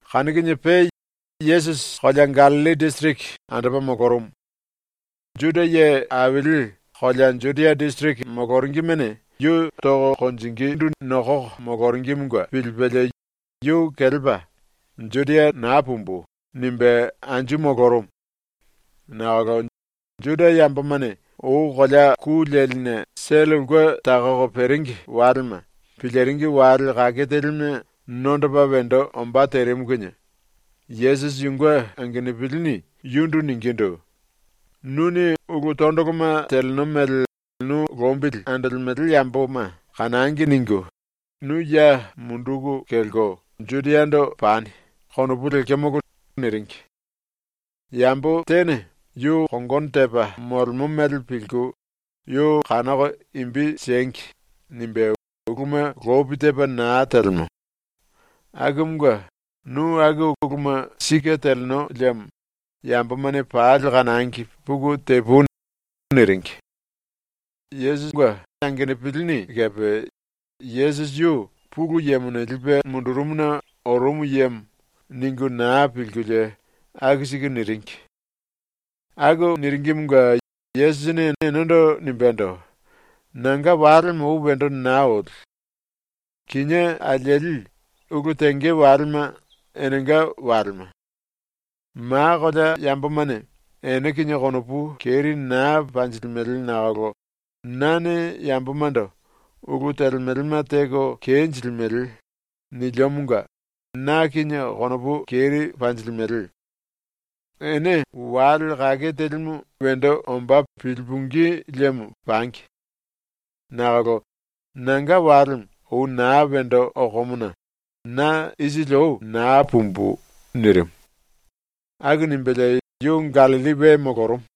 Kanu kinie pe Yesusi kolea Gallilli disiriki andopa molorumu. Juda ye aili kolea Judia disiriki moloringimene yu tonge nokoko moloringimunge pilipelie yu kelepa ‘Judia naa pumbu.’ nimbe anju molorumu. Nakolo Juda yambomane ou kolea ku leline sele ulke takoko peringi walema piliringi wale kake telime nondopa wendo ombá terimu kinie Yesusi yunge angenupilini yundu ningindu: “‘Nuni ‘ulu tondoloma teleno mele nu lombili andolemele yamboma kanangi.’ ningu nu ya munduku kelko Judiando pani.’ konopu lekemolo.” niringi. “Yambo tene ‘yu kongono tepa molemo mele pilku yu kanoko imbi siengi.’ nimbe uluma lopi tepa naa telemo. Akumunge nu aku uluma sike teleno liemo yambomane pali kanangi puku tepui.” niringi. Yesusi angenupilini kepe ‘Yesusi yu Pulu Yemone lipe mundurumuna orumu yemo.’ ningu naa pilkulie aku siku niringi. Aku niringimunge Yesusini enendo nimbendo: “Nanga walemo ou wendo naa oli. Kinié alieli ulu tenge walema enenga walema. Ma kolea yambomane ene kinie konopu keri naa panjilimele nakolo nane yambomando “Ulu telemelema teko kenjilimele.” niliomonga na kinie konopu keri panjilimele. Ene wale kake telimu wendo ombá pilipungí liemo pangi. Nakolo nanga walemo ou naa wendo okomona na ⸤isili ou⸥ naa pumbu.” nirimu. Aku nimbelie yu Gallilli we molorumu.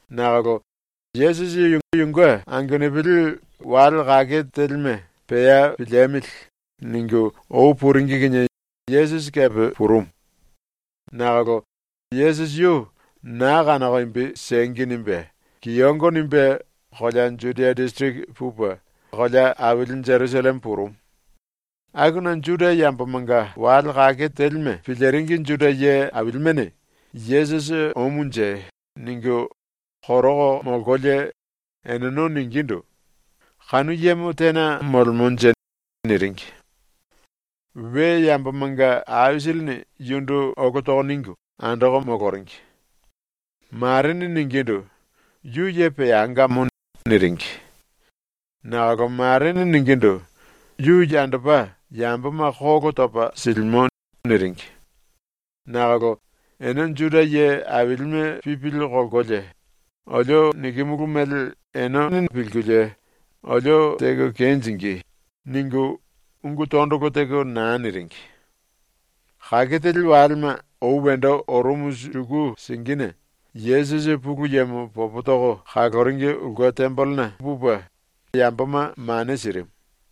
Nakolo Yesusi yunge angenupili ‘Wale kake telime pea piliemili.’ ningu ou puringi kinie Yesusi kepe purumu. Nakolo Yesusi yu ‘naa kanoko imbi siengi.’ nimbe kiyongo nimbe kolea Judia disiriki pupe kolea aili Jerusalleme purumu. Akuna Juda yambomanga wale kake telime piliringi Juda ye ailimene ‘Yesusi omunje.’ ningu koroko molkolie eneno ningindu: “Kanu yemo tena molemonje?” niringi. We yambomanga aisilini yundu olo toko ningu andoko moloringi. Marene ningindu: “Yu ye peangamo.” niringi. Nakolo marene ningindu: “Yu yandopa yamboma kolo topa silimo.” niringi. Nakolo ene Juda ye ailime pipili kolkolie ‘Olio nikimulu mele ene pilingí kinie mongo limulú.’ ningu ungu tondolo teko naa niringi. Kake teli walema ou wendo orumu suku singine Yesusi ⸤Pulu Yemo popo toko kaloringi⸥ ulke tembelena pupe yamboma mane sirimu.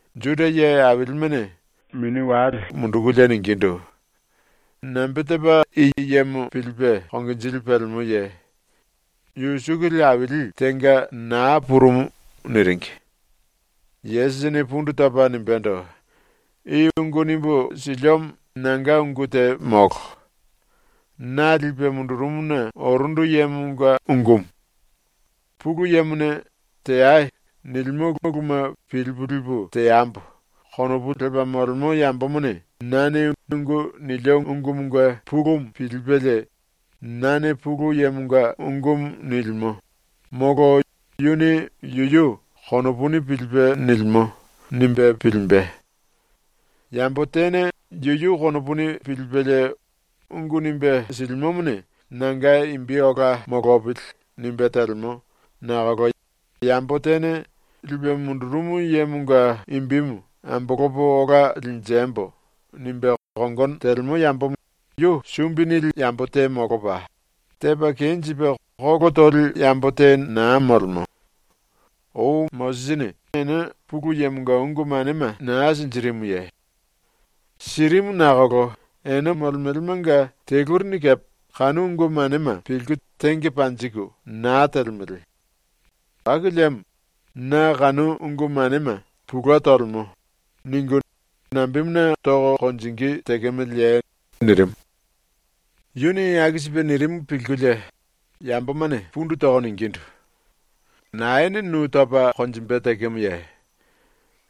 Juda ye ailimene konopu aisili liku mundukulie ningindu: “Nambe tepa i yemo pilipe konginjili pelemoye? Yu sukuli aili tenga naa purumu.” niringi. Yesusini pundu topa nimbendo: “I ungu nimbu siliomo nanga ungu te molo. Na lipe mundurumuna orundu yemonga ungumu. ‘Pulu Yemone “Teai.” nilimo uluma pilipu lipu teambo.’ konopu lepa molemo yambomone nane ungu nilio ungumunge pulumu pilipelie, ‘Nane Pulu Yemonga ungumu nilimo.’ molo ‘Yuni yuyu konopuni pilipe nilimo.’ nimbe pilimbe. Yambo tene yuyu konopuni pilipelie ungu nimbe silimomone ‘Nanga imbi ola molopili.’ nimbe telemo, nakolo yambo tene ‘Lipe mundurumu yemonga imbimu ambolopo ola linjembo.’ nimbe kongono telemo yambomo yu sumbi nili yambo te molopa, tepa kenjipe kolo toli yambo te naa molemo. Ou Mosisini ene Pulu Yemonga ungu manema naa sinjirimuye? Sirimu nakolo ene molemelemanga telurini kepe kanu ungu manema pilku tenge panjiku naa telemele. Aku liemo ‘Na kanu ungu manema pulue tolemo.’ ningu nambemuna toko konjingí tekemeleye?” nirimu. Yuni aku sipe nirimu pilkulie yambomane pundu toko ningindu: “Naene nu topa konjimbe tekemoye?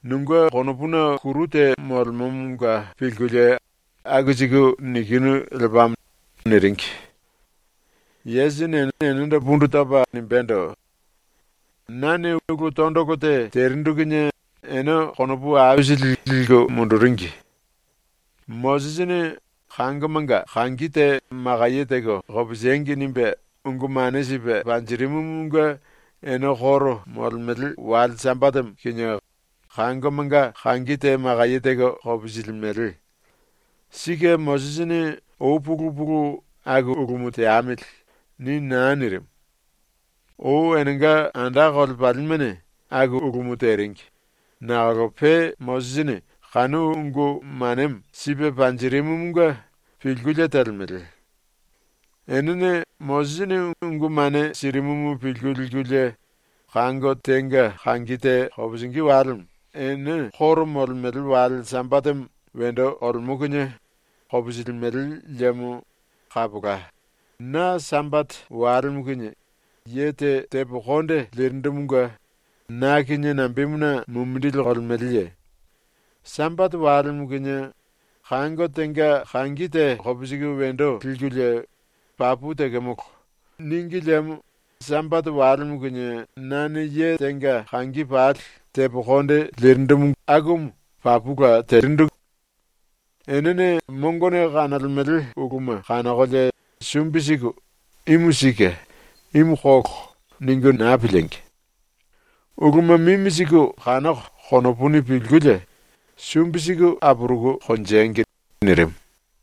Nunge konopuna kuru te molemomonga pilkulie aku siku nikinu lepamo.” niringi. Yesusini enendo pundu topa nimbendo: “Nane ulu tondolo te terindu kinie ene konopu aisili liku munduringi. Mosisini ‘Kangomanga kangi te makaye teko kopisiengi.’ nimbe ungu mane sipe panjirimumunge ene koro molemele wale Sambatemo kinie kangomanga kangi te makaye teko kopisilimele. (Sike Mosisini ou pulu pulu ‘aku ulumu teamili.’ ni naa nirimu. Ou enenga anda kolepalimene aku ulumu teringi, nakolo pe Mosisini kanu ungu manemo sipe panjirimumunge pilkulie telemele.) Enene Mosisini ungu mane sirimumu pilku likulie kango tenga kangi te kopisingí walemo ene koro molemele wale Sambatemo wendo olemo kinie kopisilimele liemo kapola na Sambate walemo kinie ye te tepo konde lirindumunge na kinie nambemuna mumindili kolemeleye? ⸤Sambate walemo kinie kango tenga kangi te kopisiku wendo likulie ‘Papu tekemolo.’ níngi liemo Sambate walemo kinie nane ye tenga kangi pali tepo konde lio akumu papula telio.⸥ Enene mongone kanolemele uluma kanokolie sumbi siku ‘Imu sike. Imu kolo.’ ningu naa piliengi! Uluma mimi siku kanoko konopuni pilkulie sumbi siku apuruku konjengi.” nirimu.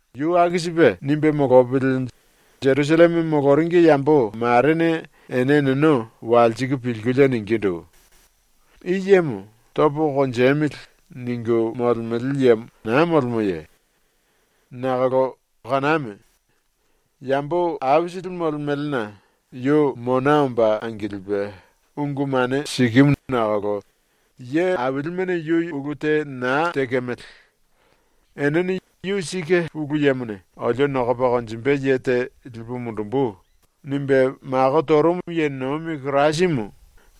Yu aku sipe nimbe molopili Jerusalleme moloringi yambo marene ene eneno walsiku pilkulie ningindu: “I yemo ‘Topo konjemili.’ ningu molemele yemo naa molemoye? Nakolo kaname. Yambo aisili molemelena yu mona omba angilipe ungu mane sikimu nakolo ye ailimene yu ulu te naa tekemele. Enene ‘Yu sike Pulu Yemone ‘Olio nokopa konjimbe ye te lipu mundumbu.’ nirimu ye nomi Kirasimu.’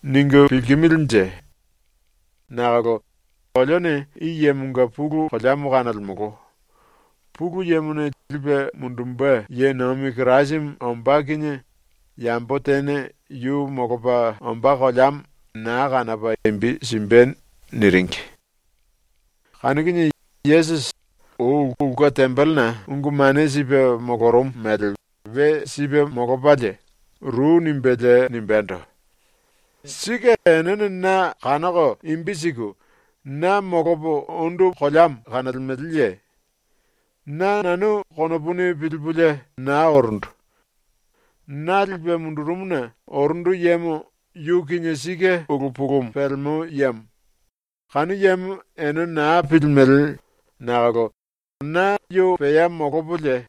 ningu pilkimilinje? Nakolo olione i yemonga pulu koleamo kanolemolo. Pulu Yemone lipe mundumbe ye nomi Kirasimu ombá kinie yambo tene yu molopa ombá koleamo naa kanopa imbi simbe.” niringi. Kanu kinie Yesusi, ou ulke tembelena ungu mane sipe molorumu mele we sipe molopalie, ru nimbelie nimbendo: “Sike enene na kanoko imbi siku, na molopo ondu koleamo kanolemeleye? Na nanu konopuni pilipulie naa orundu. Na lipe mundurumuna orundu yemo yu kinie sike ulu pulumu pelemo yemo. Kanu yemo ene naa pilimele nakolo na yu pea molopolie,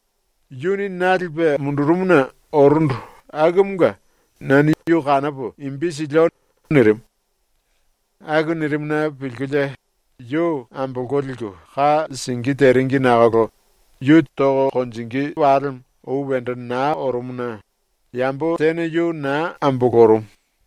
yuni na lipe mundurumuna orundu akumunge nane yu kanopo imbi silio.” nirimu. Aku nirimuna pilkulie yu ambolko liku ka singí teringi nakolo yu tonge walemo ou wendo naa orumuna yambo tene yu naa ambolorumu.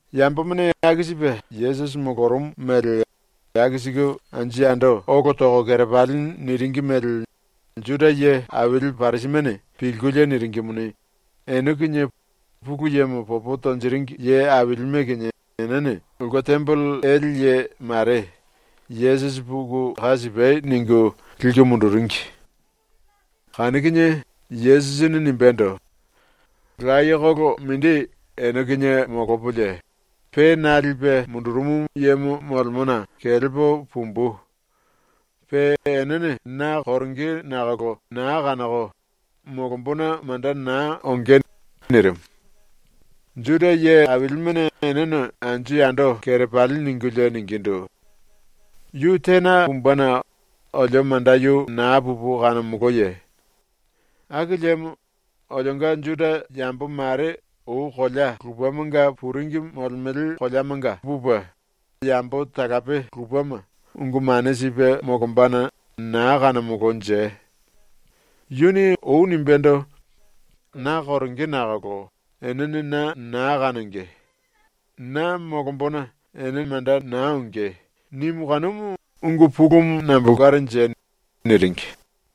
Yambomane aku sipe Yesusi molorumu mele aku siku anju yando olo toko kerepali niringi mele Juda ye aili Parisimene pilkulie niringimuni, ene kinie Pulu Yemo popo tonjiringi ye ailime kinie enene ulke tembele ele ye mare “Yesusi puku ka sipai!” ningu liku munduringi. Kanu kinie Yesusini nimbendo: “Layekolo mindi ene kinie molopolie, pe na lipe mundurumu yemo molemona kelepo pumbu. Pe enene na koronge nakolo naa kanoko, molombona manda naa onge.” nirimu. Juda ye ailimene eneno anju yando kerepali ningulie ningindu: “Yu tena pumbena olio manda yu naa pupu kanomoloye? Aku liemo olionga Juda yambo mare ou kolea lupemanga puringi molemele koleamanga pupe yambo talape lupema ungu mane sipe molombana naa kanomolonje? Yuni ou nimbendo: “Na koronge nakolo enene na naa kanonge. Na molombona ene manda naa onge.” nimu kanumu ungu pulumu nambolkanje?” niringi.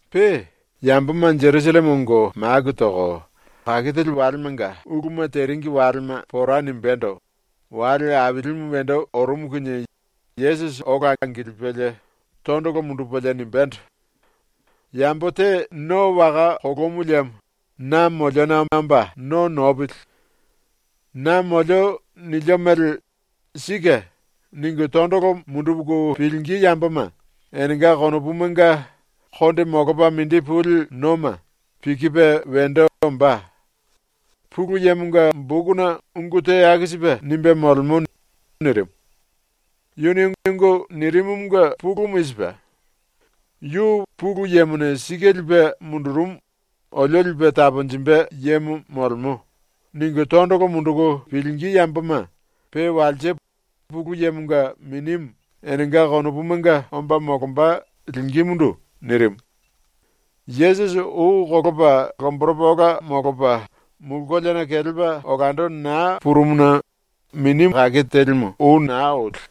Pe, yamboma Jerusalleme ongo maku toko kake teli walemanga uluma teringi walema pora nimbéndo wale ailimu wendo orumu kinie Yesusi ola angilipelie tondolo mundupelie nimbendo: “Yambo te no waka kolomu liemo na moliona omba no nopili. Na molio nilio mele “Sike.” ningu tondolo munduku pilingí yamboma enenga konopumanga konde molopa mindi puli noma pikipe wendo ombá. Pulu Yemonga bokuna ungu te aku sipe nimbe molemo.” nirimu. Yuni ungu nirimumunge pulumu i sipe: “Yu Pulu Yemone sike lipe mundurumu, olio lipe taponjimbe yemo molemo.” ningu tondolo munduku pilingí yamboma pe walse Pulu Yemonga Minimu enenga konopumanga omba molomba lingímundu nirimu. Yesusi ou kolopa lomboropa ola molopa mulu koleana kelepa olando naa purumuna Minimu ou naa oli.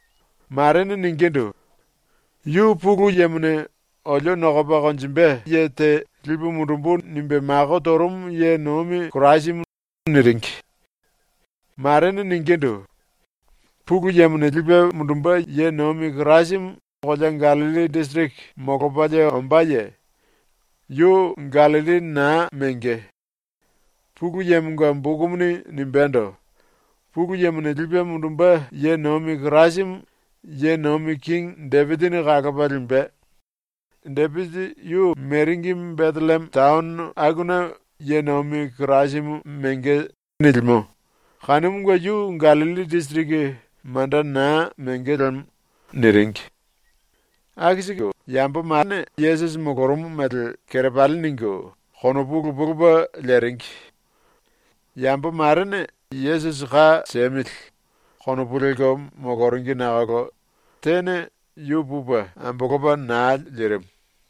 Marene ningindu: “Yu Pulu Yemone ‘olio nokopa konjimbe lipu mundumbu.’ nimbe mako torumu ye nomi Kirasimu.” niringi. Marene ningindu: “Pulu Yemone lipe mundumbe ye nomi Kirasimu kolea Gallilli disiriki molopalie ombáye? Yu Gallilli naa menge. Pulu Yemonga bokumuni nimbendo: ‘Pulu Yemone lipe mundumbe ye nomi Kirasimu ye nomi kingi Depisini kalopa limbe. Depisi yu meringi Betellieme taono akuna ye nomi Kirasimu menge.’ nilimo kanumunge yu Gallilli disiriki manda naa menge lemo.” niringi. Aku siku yamboma Yesusi molorumu mele kerepali ningu konopu lupe lupe leringi. Yambo marene ‘Yesusi ka siemili.’ konopu lelko moloringi nakolo tene yu pupe ambolopa naa lirimu.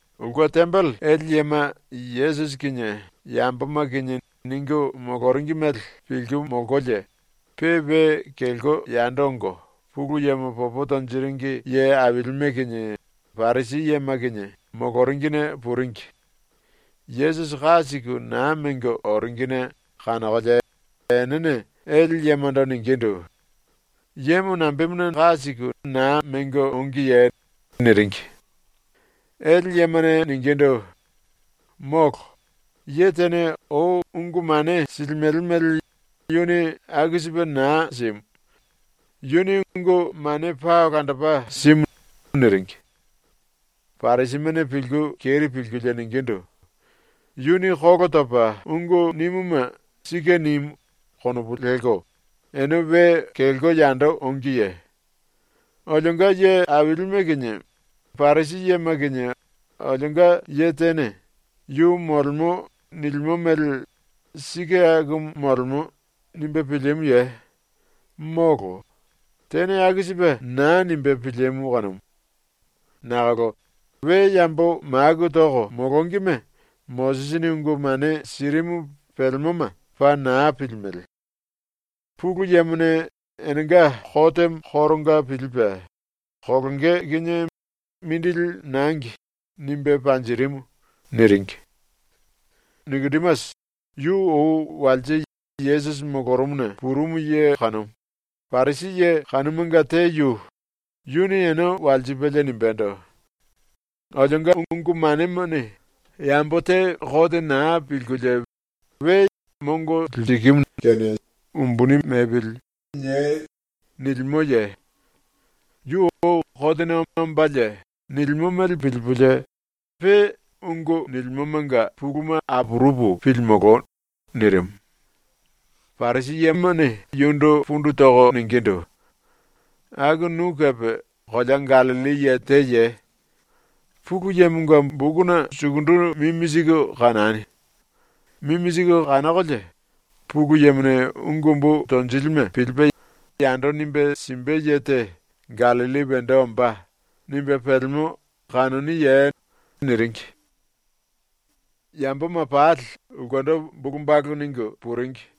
Ulke tembele ele yema Yesusi kinie yamboma kinie ningu moloringi mele pilku molkolie, pe we kelko yando ongo Pulu Yemo popo tonjiringi ye ailime kinie Parisi yema kinie moloringine puringi. Yesusi ka siku naa mengo oringine kanokolie enene ele yemando ningindu: “Yemo nambemuna naa mengo ongiye?” niringi. Ele yemane ningindu: “Molo. Ye tene ou ungu mane silimele mele yuni aku sipe naa simu. Yuni ungu mane paa olandopa simu.” niringi. Parisimene pilku keri pilkulie ningindu: “Yuni kolo topa ungu nimuma ‘Sike nimu.’ konopu lelko ene we kelko yando ongiye? Olionga ye ailime kinie Parisi yema kinie olionga ye tene “Yu molemo nilimo mele sike akumu molemo.” nimbe pilimuye? ⸤Molo, tene aku sipe naa nimbe pilimu kanumu.⸥ Nakolo we yambo maku toko molongime Mosisini ungu mane sirimu pelemoma paa naa pilimele. Pulu Yemone enenga kotemo koronga pilipe, kolonge kinie ‘Mindili nangi.’ nimbe panjirimu.” niringi. Nikodimasi, yu ou walse Yesusi molorumuna purumu ye kanumu, Parisi ye kanumanga te yu, yuni ene walsipelie nimbendo: “Olionga ungu manemane ‘Yambo te kote naa pilkulie we mongo liku siei.’ nilimoye? Yu ou kotena ombalie nilimo mele pilipulie pe ungu nilimomanga puluma apurupu pilimolo.” nirimu. Parisi yemane yundu pundu toko ningindu: “Aku nu kepe kolea Gallilli ye teye? Pulu Yemonga bokuna sukundu mimi siku kanani. Mimi siku kanokolie, ‘Pulu Yemone ungu umbu tonjilime pilipe yando nimbe simbe ye te Gallilli wendo ombá.’ nimbe pelemo kanoniye?” niringi. Yamboma pali ulkendo bulu balu ningu puringi